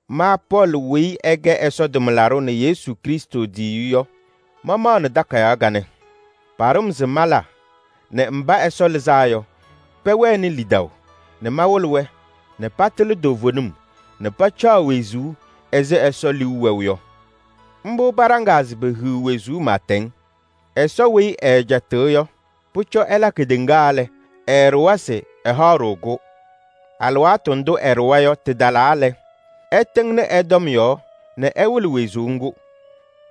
Ma Pɔɔlɩ weyi ɛkɛ Ɛsɔ tʋmlaɖʋ nɛ Yesu Krɩstʋ tiyiyu yɔ, mamaɣnɩ takayaɣ kanɛ. Paɖʋ-m se mala nɛ mba Ɛsɔ lɩzaa yɔ, pɛwɛnɩ lidaʋ nɛ mawɩlɩ-wɛ nɛ patɩlɩ toovenim nɛ pacaɣ wezuu ɛzɩ Ɛsɔ liu wɛʋ yɔ. Mbʋ paɖaŋaa se pehiɣ wezuu pɩɩtɛŋ. Ɛsɔ weyi ɛɛcɛtɩɣ yɔ, pʋcɔ ɛla kedeŋa lɛ, ɛɛɖʋwa se ɛhaɣ-ɖʋ-kʋ. Alɩwaatʋ ndʋ ɛɖʋwa yɔ tɩtalaa lɛ, ɛtɩŋnɩ ɛ-tɔm yɔɔ nɛ ɛwɩlɩ wezuu ŋgʋ.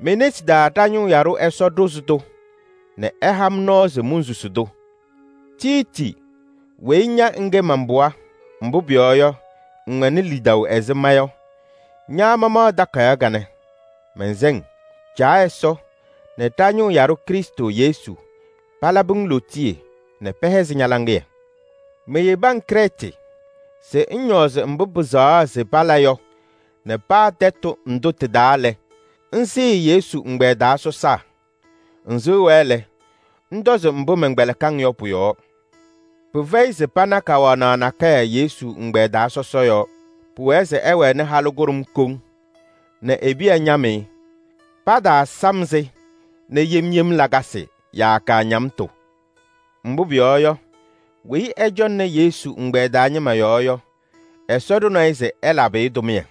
Me-nesi taa ɖa-ñʋʋ yaɖʋ Ɛsɔ ɖʋzɩ-tʋ nɛ ɛha-m nɔɔ se monsusi-tʋ. Tiiti weyi ña ŋkɛ man-pɩɣa, mbʋ pʋyɔɔ yɔ, ŋwɛnɩ lidaʋ ɛzɩ ma yɔ, ña mamaɣ takayaɣ kanɛ, mɛnsɛ-ŋ: Caa Ɛsɔ nɛ ɖa-ñʋʋ yaɖʋ Krɩstʋ Yesu palabɩ-ŋ lootiye nɛ pɛhɛzɩ ña-laŋɩyɛ. Meyebi-ŋ Krɛɛtɩ se ŋñɔɔzɩ mbʋ pɩsɛɣa se pala yɔ nɛ paa tɛtʋ ndʋ tɩ-taa lɛ, ŋsɩɩ Yesu ɛgbɛyɛ taa sɔsaa. Ŋsɩɣ-wɛ lɛ, ŋtɔzɩ mbʋ mɛnkpɛlɩkɩ-ŋ yɔ pʋ-yɔɔ: pɩfɛyɩ se pana kawanaɣ nakɛyɛ Yesu ɛgbɛyɛ taa sɔsɔ yɔɔ. Pʋwɛɛ se ɛwɛnɩ halʋ kʋɖʋm koŋ nɛ e-piya ñam-ɩ. Pataasam-sɩ nɛ yem yem lakasɩ yaa kaañamtʋ. Mbʋ pʋyɔɔ yɔ, weyi ɛcɔŋnɩ Yesu ɛgbɛyɛ taa ñɩma yɔɔ yɔ, Ɛsɔ ɖʋnɩ-ɩ se ɛlabɩ-ɩ tʋmɩyɛ.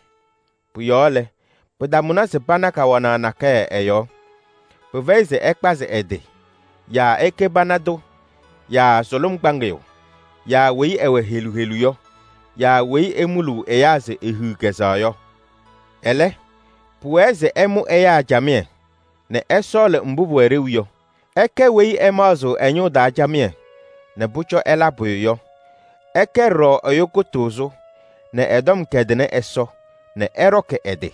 Pʋ-yɔɔ lɛ, pɩtamʋnɩ se pana kawanaɣ nakɛyɛ ɛ-yɔɔ. Pɩfɛyɩ se ɛkpazɩ ɛ-tɩ yaa ɛkɛ pana tʋ yaa sʋlʋm kpaŋɩyʋ yaa weyi ɛwɛ helu helu yɔ yaa weyi emuluu ɛyaa se ehiɣ kɛzɛɣ yɔ. Ɛlɛ, pʋwɛɛ se ɛmʋ ɛyaa camɩyɛ nɛ ɛsɔɔlɩ mbʋ pʋwɛ ɖeu yɔ. Ɛkɛ weyi ɛmaɣzɩɣ ɛ-ñʋʋ taa camɩyɛ nɛ pʋcɔ ɛla pʋyʋ yɔ. Ɛkɛ ɖɔɖɔ ɛyʋ kʋtʋʋzʋ nɛ ɛ-tɔm kɛdɩnɩ Ɛsɔ nɛ ɛɖɔkɩ ɛ-tɩ.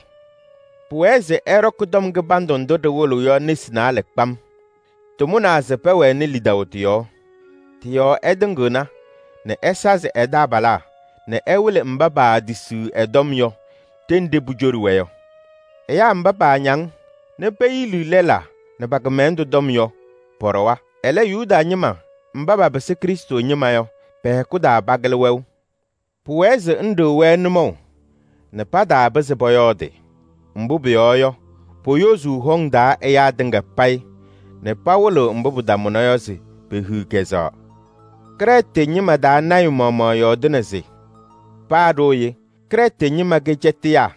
Pʋwɛɛ se ɛɖɔkɩ tɔm kɩbandʋ ndʋ ɖɩwɩlɩɣ yɔ nesi naalɛ kpam. Tɩmʋnaa se pɛwɛnɩ lidaʋ tɩ-yɔɔ. Tɩ-yɔɔ ɛtɩŋɩɣna nɛ ɛsazɩ ɛ-taabalaa nɛ ɛwɩlɩ mba paatisiɣ ɛ-tɔm yɔ ɖenɖe pucoɖi-wɛ yɔ. Ɛyaa mba paañaŋ nɛ peyili lɛlaa nɛ pa-kɩmɛlɛndʋ tɔm yɔ, pɔɖɔwa. Ɛlɛ, Yuda ñɩma mba papɩsɩ Krɩstʋ ñɩma yɔ, pɛ-hɛkʋ taa pakɩlɩ wɛʋ. Pʋwɛɛ se ŋɖɩɣ-wɛ nʋmɔʋ nɛ pataapɩzɩ pɔyɔɔdɩ. Mbʋ pʋyɔɔ yɔ, poyozuu hɔŋ taa ɛyaa tɩŋa payɩ nɛ pawɩlɩɣ mbʋ pɩtamʋna yɔ se pehiɣ kɛzɛɣ. Krɛɛtɩ ñɩma taa lɔɔyaɣ tʋ maɣmaɣ yɔɔdɩnɩ se: “Paa ɖooye Krɛɛtɩ ñɩma kɛ cɛtɩyaa,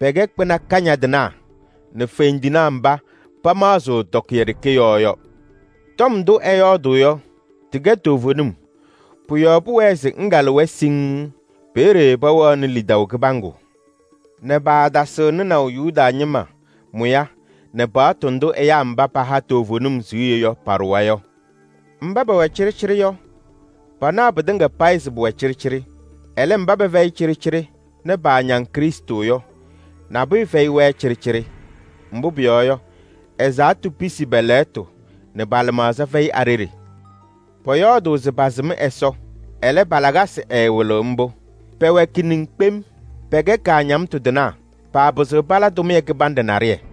pɛkɛ kpɩna kañadɩnaa nɛ fendinaa mba pamaɣzɩɣ tɔkɩyɛ ɖeke yɔɔ yɔ.” Tɔm ndʋ ɛyɔɔdʋʋ yɔ, tɩkɛ toovenim. Pʋ-yɔɔ pʋwɛɛ se ŋkalɩ-wɛ siŋŋ. Peeye pɛwɛɣnɩ lidaʋ kɩbaŋgʋ nɛ paatasɩɣ nɩnaʋ Yuda ñɩma mʋya nɛ paɣtʋ ndʋ ɛyaa mba paha toovenim siɣye yɔ paɖʋwa yɔ. Mba pɛwɛ cɩɖɩcɩɖɩ yɔ, panaɣ pɩtɩŋa payɩ se pʋwɛ cɩɖɩcɩɖɩ. Ɛlɛ, mba pɛfɛyɩ cɩɖɩcɩɖɩ nɛ paañaŋ Krɩstʋ yɔ, nabʋyʋ fɛyɩ-wɛ cɩɖɩcɩɖɩ. Mbʋ pʋyɔɔ yɔ, ɛzaɣtʋ pisi pɛ-lɛɣtʋ nɛ pa-lɩmaɣza fɛyɩ a-ɖeɖe. Pɔyɔɔdʋʋ se pasɩm Ɛsɔ, ɛlɛ, pa-lakasɩ ɛɛwɩlɩɣ mbʋ. Pɛwɛ kiniŋ kpem, pɛkɛ kaañamtʋ tɩnaa, paapɩzɩɣ pala tʋmɩyɛ kɩbanɖɛ naɖɩyɛ.